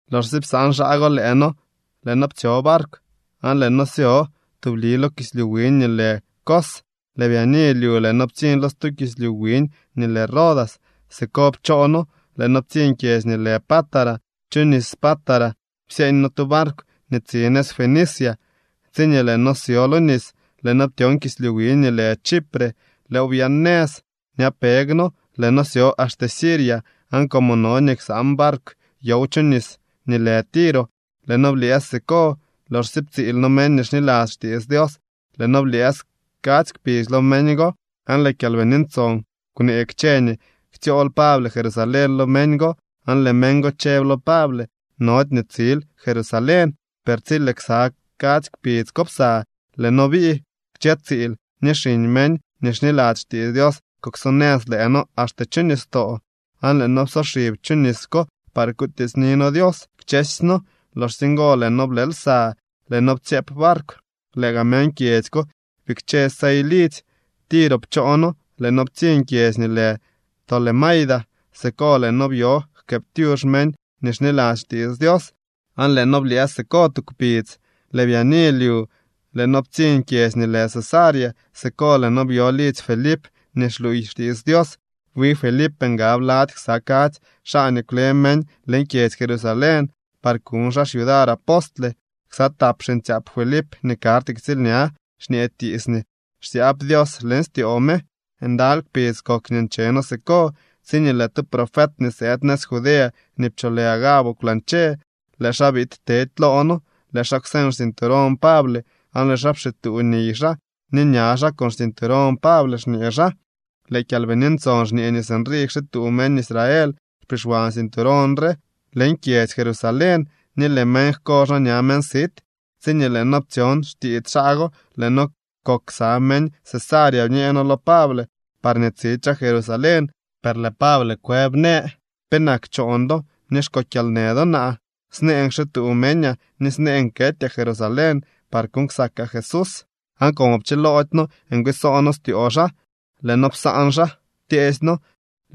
Loxsye psaan xaa go lëë noo, lëë noo ptsyo barkw aan lëë noo syo tubli lo kislyu wiñ nii lë Cos. Lëë byaani lyu lëë noo ptsiñ lo stu kislyu wiñ nii lë Rodas. Siko pchoo noo, lëë noo ptsiñ kyedzy nii lë Pátara. Chu nis Pátara psyeeñ noo tu barkw nii tsi nëz Fenicia. Tsiñee lëë noo syo lo nis, lëë noo ptyon kislyu wiñ nii lë Chipre. Lëëw byaan nëz ñapeg noo, lëë noo syo axte Siria. Aan como no nii ksaan barkw yow chu nis nii lë Tiro, lëë noo blyëës siko. Loxsye ptsiil noo meñ nii xniladzy xtiits Dios, lëë noo blyëës kadzy kpidz lo meñ go. Aan lëë Kyalbini Ntson kwnee kchë nii ktsyool Pable Jerusalén lo meñ go, aan lëë meñ go chëb lo Pable: —Nody nii tsil Jerusalén. Per tsi lëë ksa kadzy kpidz ko psa, lëë noo bii. Kchë tsiil ni xiñ meñ nii xniladzy xtiits Dios kuksonëz lëë noo axte chu nistoo, aan lëë noo psoxib chu nis ko par kutiitsni noo Dios kchësy noo. Loxsye ngo lëë noo blë lsa. Lëë noo ptsyëëp barkw, lëë gaa meñ kyedzy ko bikche sey lidzy. Tiro pchoo noo lëë noo ptsiñ kyedzy nii lë Tolemaida. Siko lëë noo byo jkëëptyux meñ nii xniladzy xtiits Dios aan lëë noo blyëës siko tu kpidz. Lëë byaani lyu lëë noo ptsiñ kyedzy nii lë Cesarea. Siko lëë noo byo lidzy Felip nii xluuy xtiits Dios. Wi Felip ngab lady ksa kadzy xaa nii kwle meñ leñ kyedzy Jerusalén par kuñ xaa xyudar apostle. Ksa tap xiñtsyaap Felip nii karty ktsiilña xñee tiits nii xsyaab Dios leñ styoo me. Ndaly kpidz kok nii nche noo siko, tsiñee lëë tu profet nii sëëd nëz Judea nii pcholë Agabo kwlañche. Lëë xaa biid tedy loo noo. Lëë xaa kwseñ xcinturón Pable aan lëë xaa pxituu niy xaa ni ña xaa con xcinturón Pable, xñee xaa: —Lëë Kyalbini Ntson xñee nii sinrii kxituu meñ Israel xpixwan cinturón re leñ kyedzy Jerusalén, ni lëë meñ jko xaa ña meñ sit. Tsiñee lëë noo ptsyon xtiits xaa go, lëë noo kok ksa meñ Cesarea bñee noo lo Pable parñee tsidy xaa Jerusalén. Per lëë Pable kwëb, në: —¿Penak choon do ni xko kyalnë do naa? Snëën kxituu meñaa, ni snëën ketyaa Jerusalén par kuuñ ksakaa Jesús. Aan como pchiloody noo ngwiisoo noo styoo xaa, lëë noo psaan xaa, ptyeesy noo: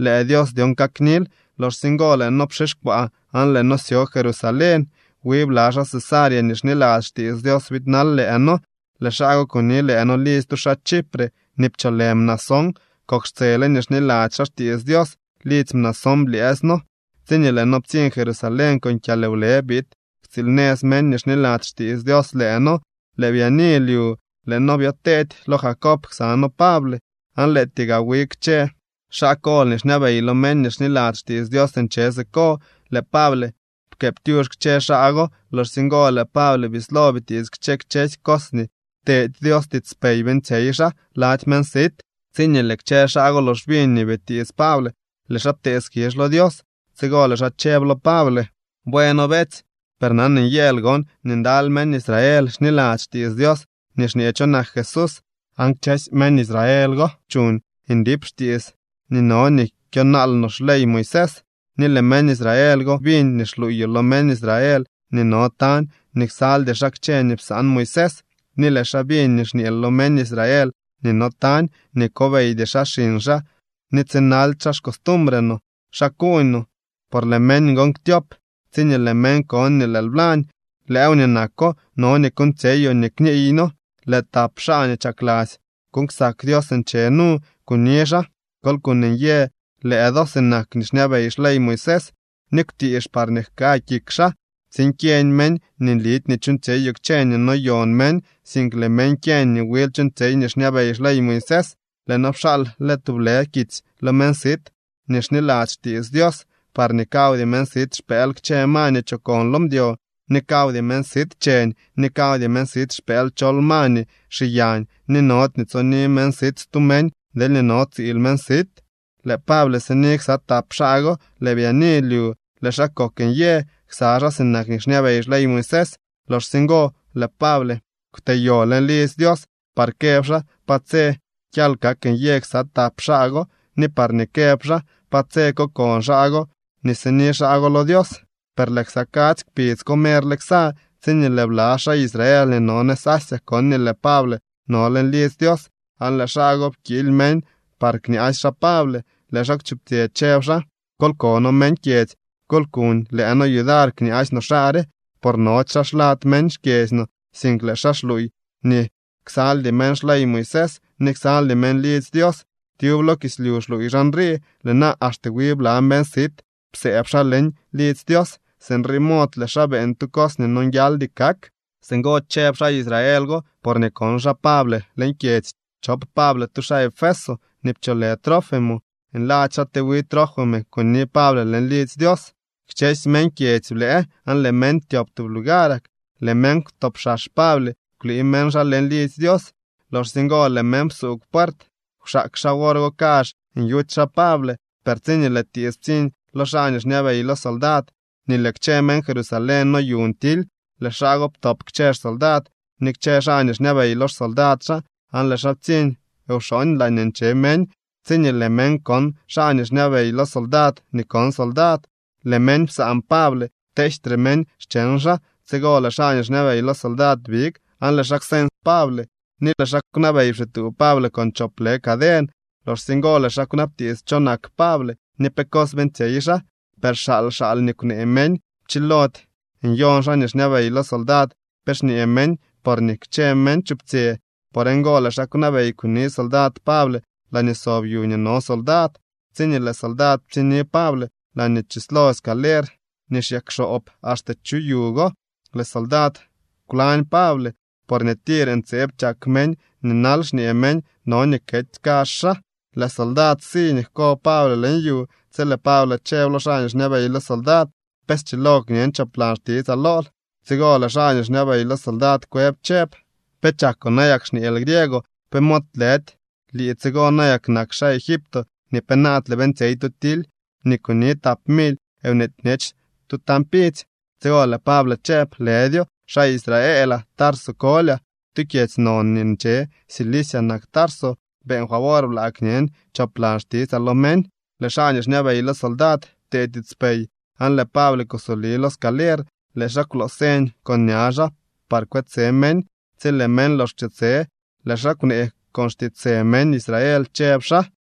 —Lëë Dios dyon kaknil. Loxsye ngo, lëë noo pxixkwaa aan lëë noo syo Jerusalén. Wi bla xaa Cesarea nii xniladzy xtiits Dios biidnal lëë noo. Lëë xaa go kuni lëë noo lidzy tu xaa Chipre nii pcholë Mnasón. Kok xtsele nii xniladzy xaa xtiits Dios. Lidzy Mnasón blyëës noo. Tsiñee lëë noo ptsiñ Jerusalén, con kyalwle biid ktsiilnëz meñ nii xniladzy xtiits Dios lëë noo. Lëë byaani lyu lëë noo byoteedy lo Jacob ksa noo Pable, aan lëëtyee gaa wi kchë xaa kol nii xñabey lo meñ nii xniladzy xtiits Dios nche siko. Lëë Pable pkëëptyux kchë xaa go. Loxsye ngo lëë Pable bislo bitiits kchë kchësy cos nii pteedy Dios tiitspey beeñtsyey xaa lady meñ sit. Tsiñee lëë kchë xaa go lox biñ nii bitiits Pable, lëë xaa ptee skizh lo Dios. Tsigo lëë xaa chëb lo Pable: —Bueno, beetsy, per nan nyëël gon nii ndaly meñ Israel xniladzy xtiits Dios nii xñee cho nak Jesús. Aan kchësy meñ Israel go chuuñ ndip xtiits nii no nii kyonaal no xley Moisés. Ni lëë meñ Israel go biñ nii xluuyoo lo meñ Israel nii no tañ nii ksaldy xaa kchë nii psaan Moisés. Ni lëë xaa biñ nii xñeel lo meñ Israel nii no tañ nii kobeydy xaa xiñ xaa ni tsinaldy xaa xcostumbre no. ¿Xa kuuñ no? Por lëë meñ gon ktyop tsiñee lëë meñ kon nii lëël blañ. Lëëw nii nako no nii kuuñtsyeyoo nii kniiy noo: Lëë tap xaa nii chakladzy kuuñ ksak Dios nche nu. Kuni xaa, kol kuuñ nyë lëë do sinak nii xñabey xley Moisés, ni kwtiix parñee jka kik xaa tsiin kyeñ meñ nii nlidy nii chuuñtsyeyoo kchë nii noyon meñ, sink lëë meñ kyeñ nii wil chuuñtsyey nii xñabey xley Moisés. Lëë noo pxaal le tublë kitsy lo meñ sit nii xniladzy xtiits Dios parñee kawdy meñ sit xpëël kchë ma nii chokon lo mdyo, ni kawdy meñ sit cheñ, ni kawdy meñ sit xpëël chol ma nii xiyañ, ni nody nii tsoni meñ sit stu meñ deelñee no tsiil meñ sit. Lëë Pable sini ksa tap xaa go. Lëë byaani lyu lëë xaa kok nyë ksa xaa sinak nii xñabey xley Moisés. Loxsye ngo lëë Pable kwteyo leñ lidzy Dios par këb xaa pa tse kyal kak nyë ksa tap xaa go ni parñee këb xaa pa tse kokon xaa go nii sini xaa go lo Dios. Per lëë ksa kadzy kpidz ko merle ksa, tsiñee lëë bla xaa Israel nii no nëz Asia kon nii lëë Pable no leñ lidzy Dios aan lëë xaa go pkiily meñ par kñaasy xaa Pable. Lëë xaa kwchuptsyë, chëb xaa: —¡Kol kono meñ kyedzy, kol kuñ lëë noo yudar kñaasy no xaa re! Por nody xaa xlad meñ xkyedzy no, sink lëë xaa xluuy nii ksaldy meñ xley Moisés ni ksaldy meñ lidzy Dios. Tyub lo kislyu xluuy xaa nrii. Lëë na axte wi bla meñ sit psëëb xaa leñ lidzy Dios. Sinrii mod lëë xaa beeñ tu cos nii nonguialdy kak. Singo chëb xaa Israel go porñee kon xaa Pable leñ kyedzy chop Pable tu xaa Efeso nii pcholë Trófimo. Nladzy xaa te wi Trófimo kuni Pable leñ lidzy Dios. Kchësy meñ kyedzy blëë aan lëë meñ ptyop tub lugarak. Lëë meñ kwtopxax Pable, kwlii meñ xaa leñ lidzy Dios. Loxsye ngo lëë meñ psuugw puert. Kwxaak xaa wor go kazh nyuty xaa Pable, per tsiñee lëë tiits ptsiñ lo xaa nii xñabey lo soldad nii lëë kchë meñ Jerusalén noyuñ tily, lëë xaa go ptop kchë xsoldad ni kchë xaa nii xñabey lo xsoldad xaa aan lëë xaa ptsiñ wxooñ laañee nche meñ. Tsiñee lëë meñ kon xaa nii xñabey lo soldad ni kon soldad, lëë meñ psaan Pable, pteejtre meñ xcheñ xaa. Tsigo lëë xaa nii xñabey lo soldad big, aan lëë xaa kwseñ Pable, ni lëë xaa kwnabey pxituu Pable con chop lë caden. Loxsye ngo lëë xaa kwnabtiits cho nak Pable ni pe cos beeñtsyey xaa. Per xaal xaal nii kwnee meñ. Pchilody nyon xaa nii xñabey lo soldad pe xñee meñ porñee kchë meñ chuptsyë. Por ngo lëë xaa kwnabey kuni soldad Pable laañee sob yu nii no soldad. Tsiñee lëë soldad ptsiñni Pable laañee chislo scaler nii xyakxoob axte chu yu go, lëë soldad kwlañ Pable, porñee tir ntseeb chak meñ nii nal, xñee meñ: —¡No nii kety kazh xaa! Lëë soldad si nii jko Pable leñ yu, tsi lëë Pable chëb lo xaa nii xñabey lo soldad: —¿Pe schilo kñen choplan xtitsaa lool? Tsigo lëë xaa nii xñabey lo soldad kwëb chëb: —¿Pe chakoo nayak xñeel griego? ¿Pe mod lëdy lii tsigo nayak nak xaa Egipto nii penaadle beeñtsyey tu tily ni kuni tap mily nweety bñech tu tañ pidzy? Tsigo lëë Pable chëb: —Lëdyo. Xaa Israelaa. Tarso kolyaa. Tu kyedzy non nii nche Cilicia nak Tarso. Beeñ favor blaa kñen choplan xtitsaa lo meñ. Lëë xaa nii xñabey lo soldad ptee tiitspey, aan lëë Pable kusoli lo scaler. Lëë xaa kwloo señ con ña xaa par kwetse meñ. Tsi lëë meñ lox kwchetse, lëë xaa kwnee con xtiitsë meñ Israel chëb xaa: